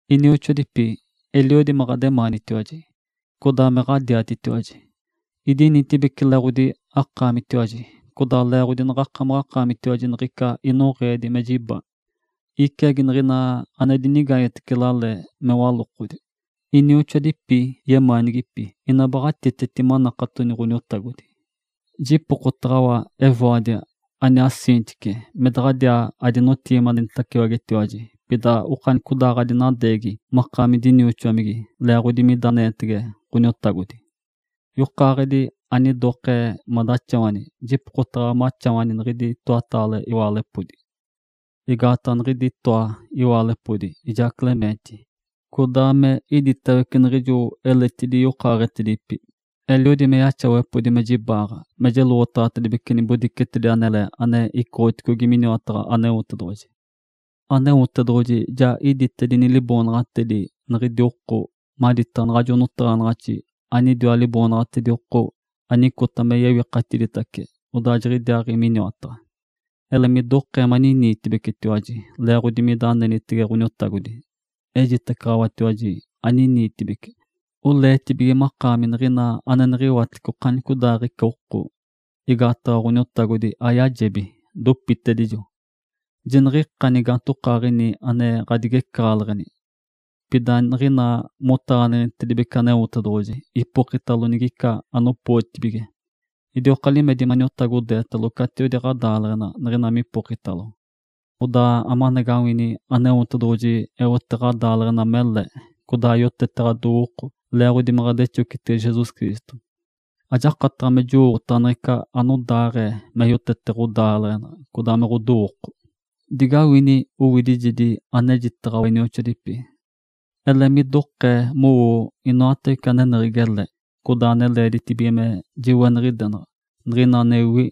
Inioxoadipi, eliodi me ɡ̶ademaanitiwaji, codaa me ɡ̶adiatitiwaji. Idinitibeci leeɡ̶odi akaamitiwaji, codaa leeɡ̶odi naɡ̶akamaɡ̶akaamitiwaji niɡ̶ica inoɡ̶eedi me jiba, iciagi niɡ̶ina ane dinigaanyetece lale me walokodi. Inioxoadipi yemaanigipi ina baɡ̶atiteti manakatoni Ǥoniotagodi. Jipokotaɡ̶awa Evódia aniaa Síntique me daɡ̶adiaa adinapeteɡ̶enitacetiwaji, pida okanicodaaɡ̶adinadeegi makaami dinioxomigi leeɡ̶odi mida anenitege Ǥoniotagodi. Yokaaɡ̶edi, anidokee madaxawani, jipokotaɡ̶awa maxawani niɡ̶idi itoataale iwaalepodi. Igaataɡ̶a niɡ̶idi itoa iwaalepodi, ijaa Clemente, codaa me iditawece niɡ̶ijo eletidi yokaaɡ̶etedipi, eliodi me yaxawepodi me jibaaɡ̶a, me jeloɡ̶otaɡ̶atedibece ɡ̶obodicetedi anele ane icoɡ̶otedicogi miniwataɡ̶a Aneotedoɡ̶oji. Aneotedoɡ̶oji ja iditedini liboonaɡ̶atedi niɡ̶idi oko maditaɡ̶a naɡ̶ajo notaɡ̶anaɡ̶axi anidiwa liboonaɡ̶atedi oko anicota me yewikatiditace odaa jiɡ̶idiaaɡ̶i miniwataɡ̶a. Ele midokee maniniitibecitiwaji leeɡ̶odi mida anenitege Ǥoniotagodi. Ejitacaɡ̶awatiwaji, aniniitibeci! Oleetibige makaami niɡ̶ina ane niɡ̶iwatece okanicodaaɡ̶ica oko. Igaataɡ̶a Ǥoniotagodi ayajebi, dopitacedijo. Jiniɡ̶ica gaantokaaɡ̶ini ane ɡ̶adigecaɡ̶aleɡ̶eni! Pida niɡ̶ina motaɡ̶aneɡ̶enitedibece Aneotedoɡ̶oji, ipokitalo niɡ̶ica anopootibige. Idioka limedi maniotagodeetalo catiwedi ɡ̶adaaleɡ̶ena, niɡ̶ina mipokitalo. Odaa amanagawini, Aneotedoɡ̶oji eote ɡ̶adaaleɡ̶enali mele, codaa yotete ɡ̶adowooko leeɡ̶odi me ɡ̶adexocitege Jesus Cristo. Ajakataɡ̶a me jowooɡ̶otaɡ̶a niɡ̶ica anodaaɡ̶ee me yotete ɡ̶odaaleɡ̶ena, codaa me ɡ̶odowooko. Digawini owidijegi anejitaɡ̶awa inioxoadipi. Ele midokee mowoo inoatawece aneneɡ̶egi ele, codaa ane leeditibige me jiweniɡ̶idenaɡ̶a, niɡ̶ina anewi,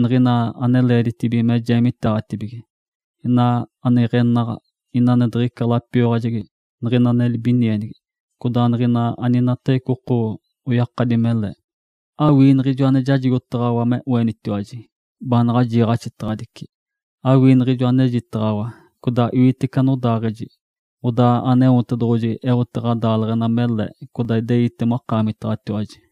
niɡ̶ina ane leeditibige me jeemiteeɡ̶atibige, ina ane iɡ̶enaɡ̶a, ina ane diɡ̶ica lapioyaɡ̶ajegi, niɡ̶ina ane libinienigi, codaa niɡ̶ina aninatawece oko oyakadi mele. Awii niɡ̶ijo ane jajigotaɡ̶awa me oenitiwaji, baanaɡ̶a jiiɡ̶axitaɡ̶adicitiwaji. Awii niɡ̶ijo anejitaɡ̶awa, codaa iwitece anodaaɡ̶eji. Odaa Aneotedoɡ̶oji eote ɡ̶adaaleɡ̶ena mele, codaa ideite makaamitaɡ̶atiwaji.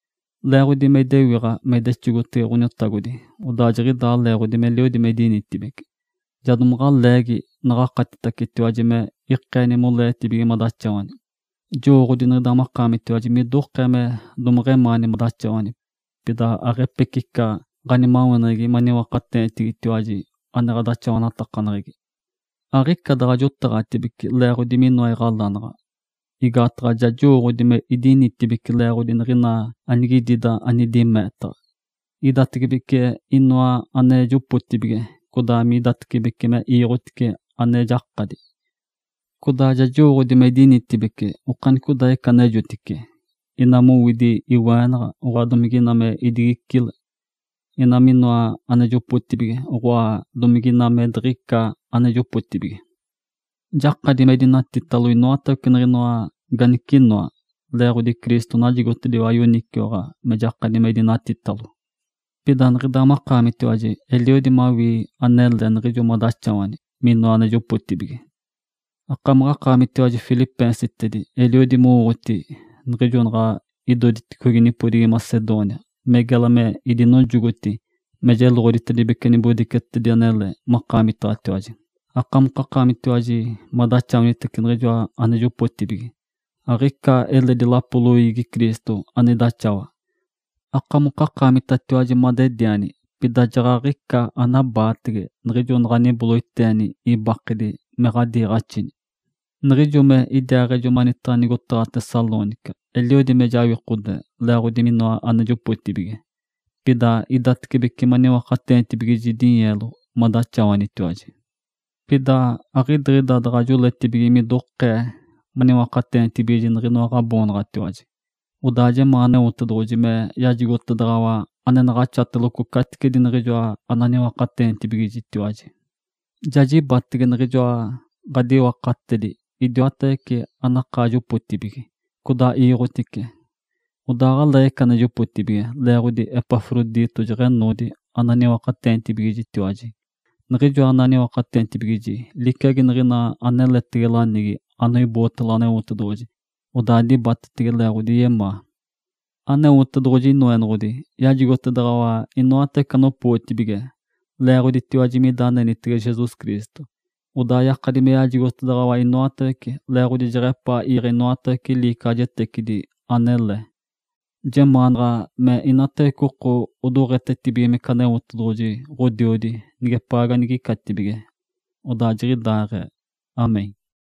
Leeɡ̶odi me idewiɡ̶a me idexogotege Ǥoniotagodi, odaa jiɡ̶idaa leeɡ̶odi meliodi me idinitibeci, ja domaɡ̶a leegi, naɡ̶akatitacetiwaji me ikeeni moleetibige madaxawani. Jowooɡ̶odi niɡ̶ida makaamitiwaji midokee me domeɡ̶emaani madaxawani, pida aɡ̶epecica ɡ̶animaweneɡ̶egi maniwakateenitiwa ane ɡ̶adaxawanatakaneɡ̶egi. Aɡ̶ica daɡ̶a jotaɡ̶atibece leeɡ̶odi minoa iɡ̶alanaɡ̶a. Igaataɡ̶a ja jowooɡ̶odi me idinitibeci leeɡ̶odi niɡ̶ina anigidida anidi meetaɡ̶a. Idatecibece minoa ane jopotibige, codaa midatibece me iiɡ̶otice ane jakadi. Codaa ja jowooɡ̶odi me idinitibeci okanicodaaɡ̶ica anejotice, ina mowidi iweenaɡ̶a, oɡ̶oa, domige ina me idigicile; ina me inoa ane jopotibige, oɡ̶oa, domige ina me diɡ̶ica ane jopotibige. Jakadi me idinatitalo inoatawece niɡ̶inoa ganicinoa, leeɡ̶odi Cristo najigotediwa yoniciwaɡ̶a me jakadi me idinatitalo. Pida niɡ̶ida makaamitiwaji eliodi mawii anele niɡ̶ijo madaxawani minoa ane jopotibige. Akamaɡ̶akaamitiwaji, filipeensitedi, eliodi mowooɡ̶oti niɡ̶ijo naɡ̶a idoditicogi nipodigi Macedônia, me gela me idinojogotini me jeloɡ̶oditedibece nibodicetedi anele makaamitaɡ̶atiwaji, akamokakaamitatiwaji madaxawanitece niɡ̶ijoa ane jopotibige. Aɡ̶ica eledi lapo loiigi Cristo ane idaxawa. Akamokakaamitatiwaji madediani, pida jaɡ̶aɡ̶ica anabaatege niɡ̶ijo naɡ̶aniboloiteeni ibakedi me ɡ̶adiiɡ̶axini. Niɡ̶ijo me idiaaɡ̶ejo mani nigotaɡ̶a Tessalônica, eliodi me jawikode leeɡ̶odi minoa ane jopotibige. Pida idatibece maniwakateenitibigiji dinyeelo madaxawanitiwaji. Pida aɡ̶idiɡ̶ida daɡ̶a joletibige midokee maniwakateenitibigiji niɡ̶inoa ɡ̶aboonaɡ̶atiwaji. Odaa jemaa Aneotedoɡ̶oji me yajigotedaɡ̶awa ane naɡ̶axateloco caticedi niɡ̶ijoa ananiwakateenitibigiji. Ja jibatege niɡ̶ijoa ɡ̶adiwakatedi idiwatawece anakaa jopotibige, codaa iiɡ̶otedice. Odaa aɡ̶aleeɡ̶ica ane jopotibige, leeɡ̶odi Epafrodito jeɡ̶enoodi ane aniwakateenitibigijitiwaji. Niɡ̶ijoa ane aniwakateenitibigijitiwaji liciagi niɡ̶ina aneletege lanigi anoibootalo Aneotedoɡ̶oji, odaa dibatetege leeɡ̶odi yemaa. Aneotedoɡ̶oji Inoenoɡ̶odi yajigotedaɡ̶awa inoatawece anopootibige leeɡ̶oditiwaji mida anenitege Jesus Cristo. Odaa yakadi me yajigotedaɡ̶awa inoatawece, leeɡ̶odi jeɡ̶epaa iiɡ̶e inoatawece liicaɡ̶ajetecidi anele. Jemaanaɡ̶a me inatawece oko odoɡ̶etetibigimece Aneotedoɡ̶oji Ǥodiodi nigepaa ganigicatibige. Odaa jiɡ̶idaaɡ̶ee. (Amém.)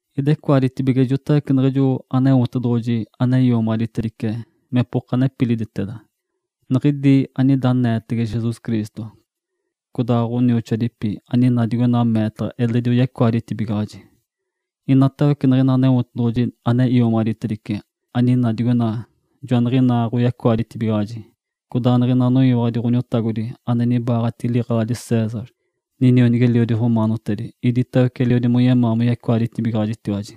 Idecoaditece ijotawece niɡ̶ijo Aneotedoɡ̶oji ane iomaɡ̶aditedice mepoka nepiliditeda, niɡ̶idi anida aneetege Jesus Cristo. Codaa ɡ̶onioxoadipi aninaa digoina meetaɡ̶a eledi oyecoaditibigaɡ̶ajitiwaji. Inatawece niɡ̶ina Aneotedoɡ̶oji ane iomaɡ̶aditedice, aninaa digoina, joaniɡ̶inaa oyecoaditibigaɡ̶ajitiwaji, codaa niɡ̶ina anoyiwaɡ̶adi Ǥoniotagodi ane nibaaɡ̶atigi liɡ̶eladi César, ninionigi-eliodi romaanotedi, iditawece eliodi moyemaa moyecoaditibigaɡ̶ajitiwaji.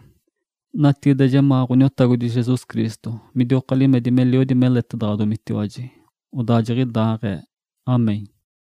Natigide jemaa Ǥoniotagodi Jesus Cristo midioka limedi meliodi meletedaɡ̶adomitiwaji. Odaa jiɡ̶idaaɡ̶ee. (Amém.)